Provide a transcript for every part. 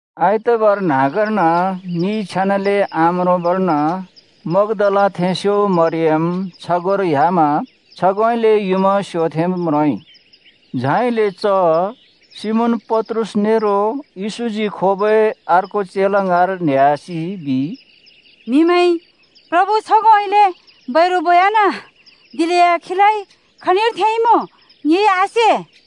आइतबार न्हाँगर्न मि छेनाले आम्रोंबर्न मग्दालाथेंस्यो मरियम छगोंर ह्‍यामा छगोंउँइँले युँमा स्योथेंब् म्रोंइ। झाइले च सिमोन पत्रुस नेरो येशूजी खोबै अर्को चेला ङाँर न्हेह्‍यासि बिइ, “म्हिमैंइ प्रभु छगोंउँइँले बैरु बोयाना! दिलेया खीलाइ खनिर थेंइँमुँ ङिइ आसे।”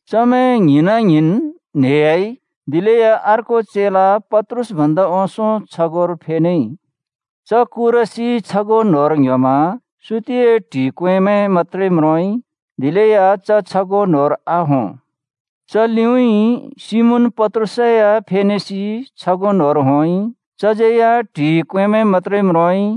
चमैं ङ्हिंना-ङ्हिंन् न्हेह्‍याइ दिलेया अर्को चेला पत्रुस भन्दा ओंसों छगोंर फेनेइ। च कुरसि छगों न्‍होंर ङ्‌ह्‍योमा सुतिए ट्हि क्वेंमैं मत्‍त्रे म्रोंइ, दिलेया च छगों न्होंर आहों। च लिउँइँ सिमोन पत्रुस या फेनेसि छगों न्होंर होंइ। चज्यै या ट्हि क्वेंमैं मत्‍त्रे म्रोंइ।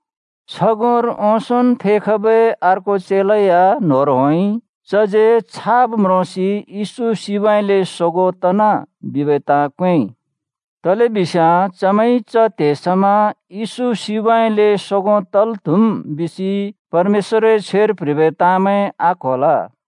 छगोंर ओंसोंन् फेखबै अर्को चेला या न्होंर होंइ। चज्यै छाब् म्रोंसि येशू सिबउँइँले सोगों तना बिबै ताँ क्वेंइ। (तलेबिस्याँ चमैंइ च त्हे समा येशू सिबउँइँले सोगों तल् त्हुम् बिसि परमेश्‍वरए छ्वेर प्‍ह्रिबै ताँमैं आक्होल।)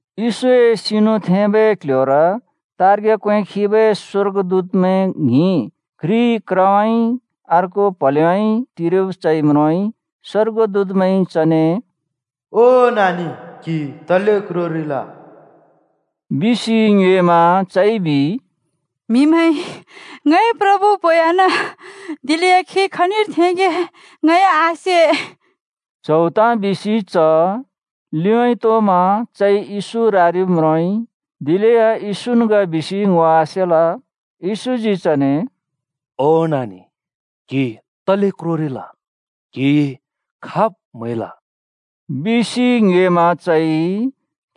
येशूए सिनु थेंबै क्ल्ह्‍योर तार्ग्या क्वें खिबै स्वर्गदूतमैं ङ्हिं घ्रि क्रउँइँ अर्को प्हलेउँइँ टिरिब चइ म्रोंइ। स्वर्गदूतमैंइ चने “ओ नानि, क्‍हि तले क्रोरिल?” बिसि ङ्योएमा चइ बिइ, “म्हिमैंइ ङए प्रभु बोयाना। दिलेया खी खनिर थेंगे ङइ आसे।” च्हौ ताँ बिसि च लिउँइँ तोमा चइ येशू रारिब् म्रोंइ। दिलेया येशून् ग बिसि ङो आसेल। येशूजी चने “ओ नानि, क्‍हि तले क्रोरिल? क्‍हिइ खाब् म्‍हैल?” बिसि ङ्योएमा चइ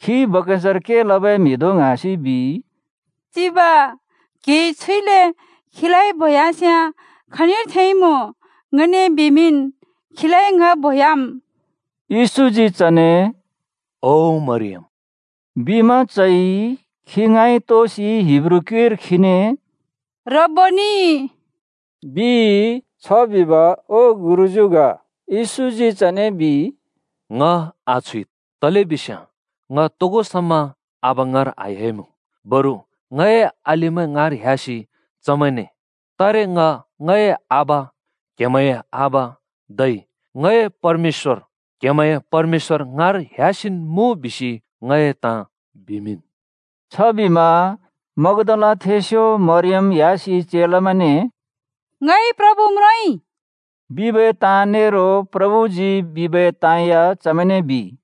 खी बगैंचार के लबै म्हि धों ङ्हाँसि बिइ, “चिब, क्‍हिइ छुइले खीलाइ बोयास्याँ, खनिर थेंइँमुँ ङने बिमिंन्। खीलाइ ङ बोह्‍याम्।” येशूजी चने “ओ मरियम” बिमा चइ खी ङाँइ तोसि हिब्रू क्युइर खीने “रब्‍बोनि” बिइ। (छ बिब “ओ गुरुज्‍यू” ग।) येशूजी चने बिइ, “ङ आछुइद् तलेबिस्याँ ङ तोगो समा आबा ङाँर आह्‍याइमुँ। बरु ङए अलिमैं ङाँर ह्‍यासि चमैंने ‘तारे ङ ङए आबा, क्हेमैंए आबा, धै ङए परमेश्‍वर, क्हेमैंए परमेश्‍वर ङाँर ह्‍यासिन् मुँ’ बिसि ङए ताँ बिमिंन्।” छबिमा मग्दालाथेंस्यो मरियम ह्‍यासि चेलामैंने “ङइ प्रभु म्रोंइ!” बिबै ताँ नेरो प्रभुजी बिबै ताँ या चमैंने बिइ।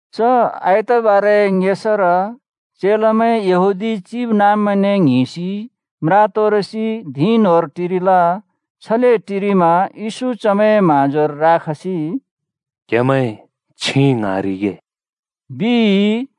च आइतबारए ङेसार चेलामैं यहूदी चिबनाँब्मैंने ङ्हिंसि म्रा तोरसि धिं न्होंर टिरिल। छले टिरिमा येशू चमैंए म्हाँजोर राखसि “क्हेमैं छिं ङ्हाँरिगे,” बिइ।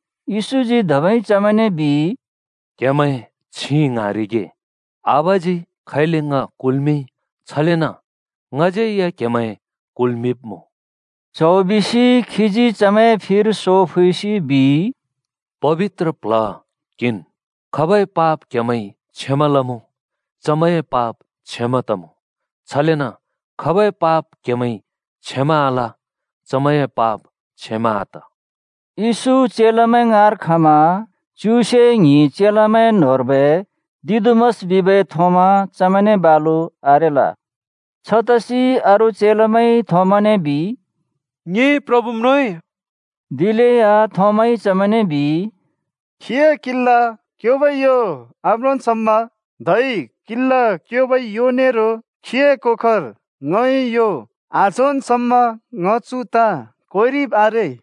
येशूजी धबै चमैंने बिइ, “क्‍हेमैं छिं ङ्हाँरिगे! आबाजी खैले ङ कुल्‍मिंइ, छलेन ङज्‍यै या क्‍हेमैं कुल्मिंब्मुँ।” च्हौ बिसि खीजी चमैंए फिर सो फुइसि बिइ, “पबित्र प्ल्ह किंन्। खाबै पाप क्हेमैंइ क्षमा लमुँ, चमैंए पाप क्षमा तमुँ। छलेन खाबै पाप क्हेमैंइ क्षमा आल, चमैंए पाप क्षमा आत।” येशू चेलामैं ङाँर खमा च्युसे ङ्हिं चेलामैं न्होंर्बै दिदुमस बिबै थोमा चमैंने बालु आरेल। छतसि अरू चेलामैंइ थोमाने बिइ, “ङिइ प्रभु म्रोंइ।” दिलेया थोमाइ चमैंने बिइ, “खीए किला क्योबै यो आम्रोंन् समा धै किला क्योबै यो नेरो खीए कोखर ङए यो आझोंन् समा ङ चु ताँ क्वेंरिब् आरे।”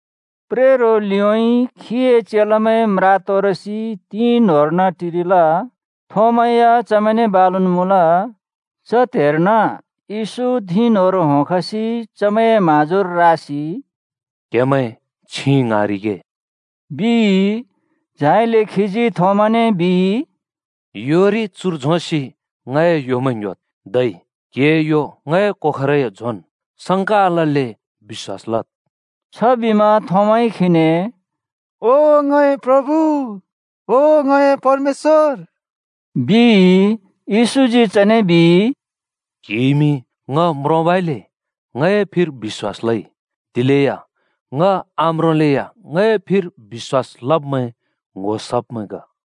प्रेरो लिउँइँ खीए चेलामैं म्रा तोरसि धिं न्होंर्न टिरिल। थोमा या चमैंने बालुन् मुँल। च त्हेर्न येशू धिं न्होंर होंखसि चमैंए म्हाँजुर रासि “क्‍हेमैं छिं ङ्हाँरिगे,” बिइ। झाइले खीजी थोमाने बिइ, “योरि चुर झोंसि ङए योमैं ङ्‍ह्‍योद्। धै क्‍हिए यो ङए कोखरै झोंन्। संका आलल्‍ले बिश्‍वास लद्।” छबिमा थोमाइ खीने “ओ ङए प्रभु, ओ ङए परमेश्‍वर!” बिइ। येशूजी चने बिइ, “क्‍हिइमि ङ म्रोंबइले ङए फिर बिश्‍वास लइ, दिलेया ङ आम्रोंलेया ङए फिर बिश्‍वास लब्मैं ङ्‍हो सब्मैं ग।”